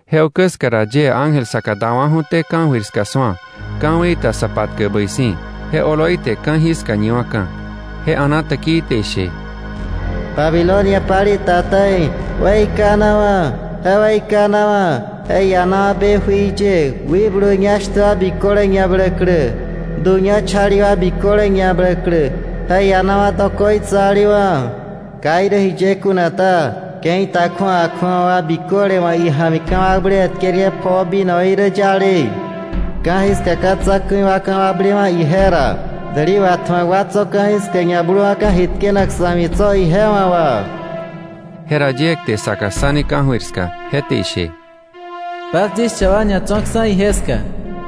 Je ukä ska ra yie ángel saka dawa̱ju̱té ka̱jöir ska su̱a, ka̱wei ta sa patkäk bäi si̱. Je oloi te ka̱jiska ñiwa̱ka̱. Je a̱na täkii te ishe: “¡Babilonia palei ta ta̱i, weikanawa̱, je weikanawa̱! Je ianawa̱ be jui ye, wikblu ñá shtä wa biköle ñabläklä, du ñá chali wa biköle ñabläklä. Je ianawa̱ dokoitsalewa̱. Ka irä jiye kuna ta, ke̱i ta kju̱awa kju̱awa wa biköle wa̱ ija̱mi ka̱wakblewe̱ tkerke̱ pjoo vinoí rä yale. Ka̱jiska ka̱ tsa̱ku̱i wa ka̱wakblewa̱ ije ra. Däli watju̱ak wa tso̱ ka̱jiska ñabluwa̱ka̱ ji tkenak sa̱ ja̱mi tso̱ ije wa̱ wà.” Jera yie kte saka ssani ka̱jöir ska, je te ishe: “Bas yis cha wa ñatso̱ksa̱ ije ska,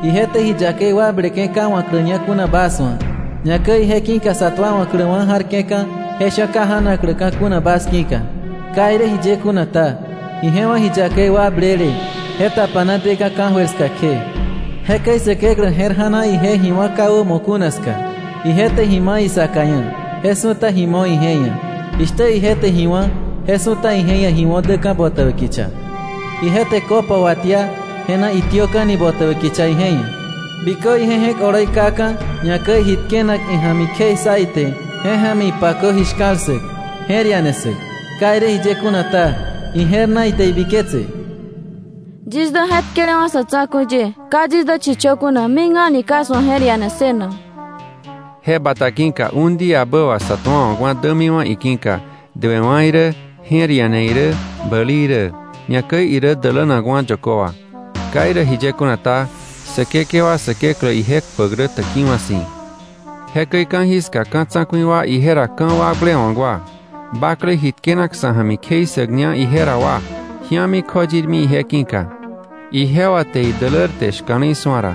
ije te ji yakei wakbleke̱ ka wa̱kläña kuna bas wa̱, ñakäi ije ki̱ka sa tuawa̱kläwa̱ ja̱rke̱ka̱, je sha̱ ka ja̱nakläka̱ kuna bas ki̱ka. Ka irä jiye kuna ta, ije wa̱ ji yakei wakblele, je tapana deka̱ ka̱jöir ska kje. Jekäi Säkeklä je̱r ja̱na, ije ji wá̱ ka wämo kuna ska. Ije te ji ma̱ isaka ia̱, je su̱ta ji mo̱ ije ia̱. Jishtä ije te ji wá̱, je su̱ta ije ia̱ ji wo̱ däka̱ botäbä kicha. Ije te copa watia, je na itiöka̱ni botäbä kicha ije ia̱. Bikö ije je̱k oloi kaka̱, ñakäi ji tkenak ija̱mi kjei ssa ite, je ja̱mi ipakö ji shka̱l ssäk, je̱r iane ssäk. Ka irä jiye kuna ta, ije̱r na ite ibiketse: ‘Yis dä je̱tkelewa̱ sa̱ tsa̱ku̱i ye, ka yis dä chichö kuna, mik a̱ni ka yis wa̱ je̱r iane ssënak.’ Je bata ki̱ka un díabä wà sä tuawa̱kwa̱ dämiwa̱ iki̱ka: duewa̱ irä, je̱r iane irä, bäli irä; ñakäi irä dälänakwa̱ yökö wà. Ka irä jiye kuna ta, Säkekewa Säkeklä ije kpäk rä täkiwa̱ si̱.” Jekäi ka̱jiska ka̱ tsa̱ku̱i wa ije ra ka̱wakblewa̱k wa, bakle ji tkenak sa̱ ja̱mi kjei ssäkña ije ra wa ji̱ami kjoyirmi ije ki̱ka, ijewa te idälärte shka̱le̱i su̱a ra.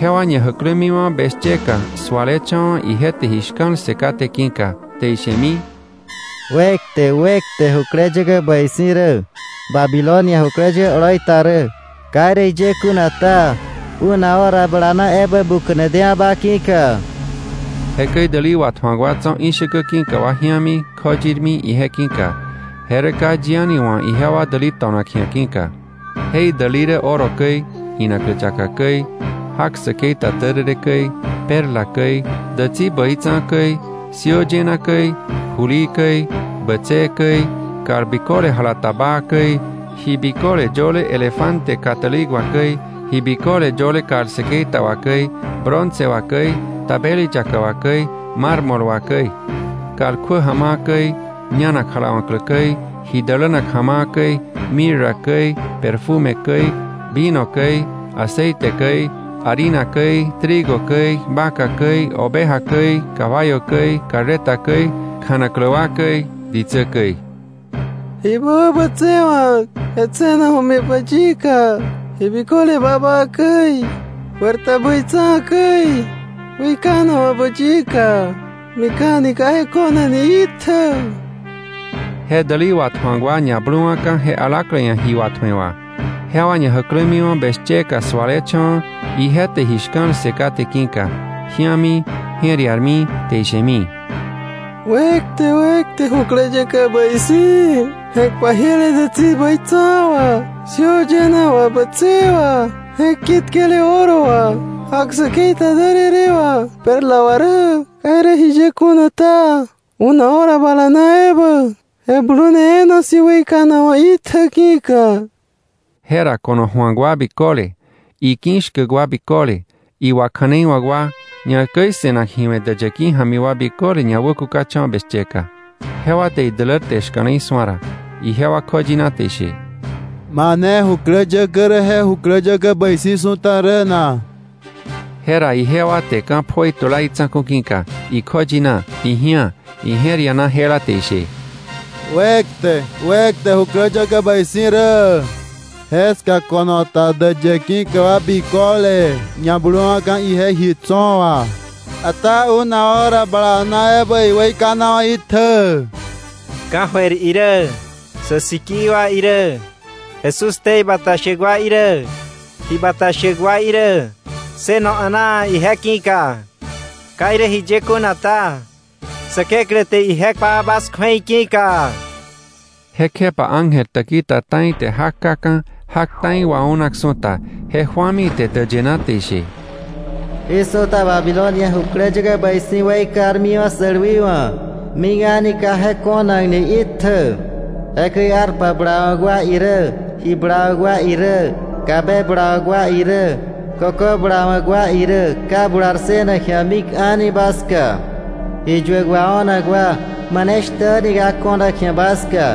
Jewa ñajäklämiwa̱ beshyeka sualecha̱wa̱ ije te ji shka̱l ssë kate ki̱ka, te ishemi: “¡Wekte, wekte, jukläyäkä bäi si̱ rä, Babilonia jukläyäkä oloi ta rä! Ka irä jiye kuna ta, una hora bala na ebä buka̱ne dewa̱ ba ki̱ka.” Jekäi däli watju̱ak wa tso̱ ishäkä ki̱ka wa ji̱ami, kjoyirmi ije ki̱ka, je rä ka yi a̱ni wa̱ ijewa däli to̱nak ji̱a ki̱ka. Je idäli rä oro käi, inaklä yaka käi, jak säkei ta därërë käi, perla käi, dätsi bäi tsa̱a̱ käi, siöö yëna käi, julii käi, bätsëë käi, kal biköle jala ta baa käi, ji biköle yöle elefante kà tälik wà käi, ji biköle yöle kal säkei ta wà käi, bronce wà käi, tabeli yaka wà käi, mármol wà käi; kal kjuä ja̱ma̱a̱ käi, ñanak jalawa̱klä käi, ji dälänak ja̱ma̱a̱ käi, mirra käi, perfume käi, vino käi, aceite käi, harina käi, trigo käi, vaca käi, oveja käi, caballo käi, carreta käi, kjanaklä wa käi, ditsä käi. “¡Ji ba wäbätsewa̱k, je tse̱naju̱mi ba yika, ji biköle babaa käi, juer ta bäi tsa̱a̱ käi, weikanawa̱ ba yika, mik a̱ni ka je ko̱nakni itjä!” Je däli watju̱ak wa ñabluwa̱ka̱ je alaklä ia̱ ji watju̱e wà, jewa ñajäklämiwa̱ beshyeka su̱alecha̱wa̱ ije te ji shka̱l ssë kate ki̱ka, ji̱ami, je̱r iarmi, te ishemi: “¡Wekte, wekte jukläyäkä bäi si̱, je̱k pajiele dätsi bäi tsa̱a̱ wà, siöö yëna wà, bätsëë wà, je̱k ki̱tkele oro wà, jak säkei ta därërë wà, perla wà rä! Ka irä jiye kuna ta, una hora bala na ebä je blune e̱e̱na si̱ weikanawa̱ itjä ki̱ka!” Jera ko̱no ju̱ak wa biköle, iki̱ shkäk wa biköle, iwakja̱neiwa̱k wa, ñakäi se̱nak ji we̱ däyë ki̱ ja̱mi wa biköle ñawäkukacha̱wa̱ beshyeka. Jewa te idälärte shka̱le̱i su̱a ra, ijewa kjoyina te ishe: “¿Mane jukläyäkä rä je jukläyäkä bäi si̱ su̱ta rä na?” Jera ijewa te ka̱ pjoi tula itsa̱ku̱ ki̱ka, ikjoyina, iji̱á, ije̱r iana jela te ishe: “¡Wekte, wekte jukläyäkä bäi si̱ rä. Jeska ko̱no ta däyë ki̱ka wa biköle ñabluwa̱ka̱ ije ji tso̱ wà. Ata una hora bala na ebä iweikanawa̱ itjä!” Ka̱jöir irä, sä sikii wa irä, Jesús ktei bata shäk wa irä, ji bata shäk wa irä, ssëno a̱naa ije ki̱ka. Ka irä jiye kuna ta, Säkeklä te ije kpa bas kju̱ei ki̱ka. Jekjepa ángel täki ta ta̱i te jak kaka̱, jak ta̱i waunak su̱ta, je ju̱ami ite däyë na te ishe: “Jí su̱ta Babilonia jukläyäkä bäi si̱ weikarmiwa̱ sälwiwa̱, mik a̱ni ka je ko̱nakni itjä. Jekäi arpa bulawa̱k wa irä, ji bulawa̱k wa irä, kabe bulawa̱k wa irä, kökö bulawa̱k wa irä, ka bular ssënak ji̱a mik a̱ni ba ska. Ji yuäk wao̱nak wa maneshtä a̱ni ka ko̱nak ji̱a ba ska.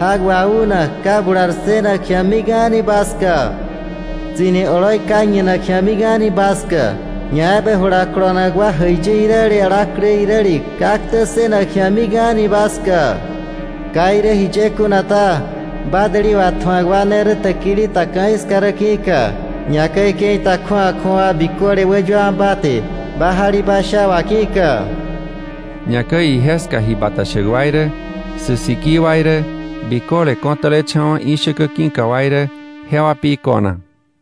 Jak waunak ka bular ssënak ji̱a mik a̱ni ba ska. Tsi̱ni oloi ka ñinak ji̱a mik a̱ni ba ska. Ñaebä jula kolonak wa jäiyi iräle, alaklä iräle ka ktä ssënak ji̱a mik a̱ni ba ska. Ka irä jiye kuna ta, ba däli watju̱ak wa, jewa ne rä täki ta ka̱jiska rä ki̱ka, ñakäi ke̱i ta kju̱awa kju̱awa wa biköle wäyuawa̱ ba te ba jalibasha wà ki̱ka.” Ñakäi ije ska ji bata shäk wa irä, sä sikii wa irä, biköle ko̱tälecha̱wa̱ ishäkä ki̱ka wa irä, jewa pi ko̱na.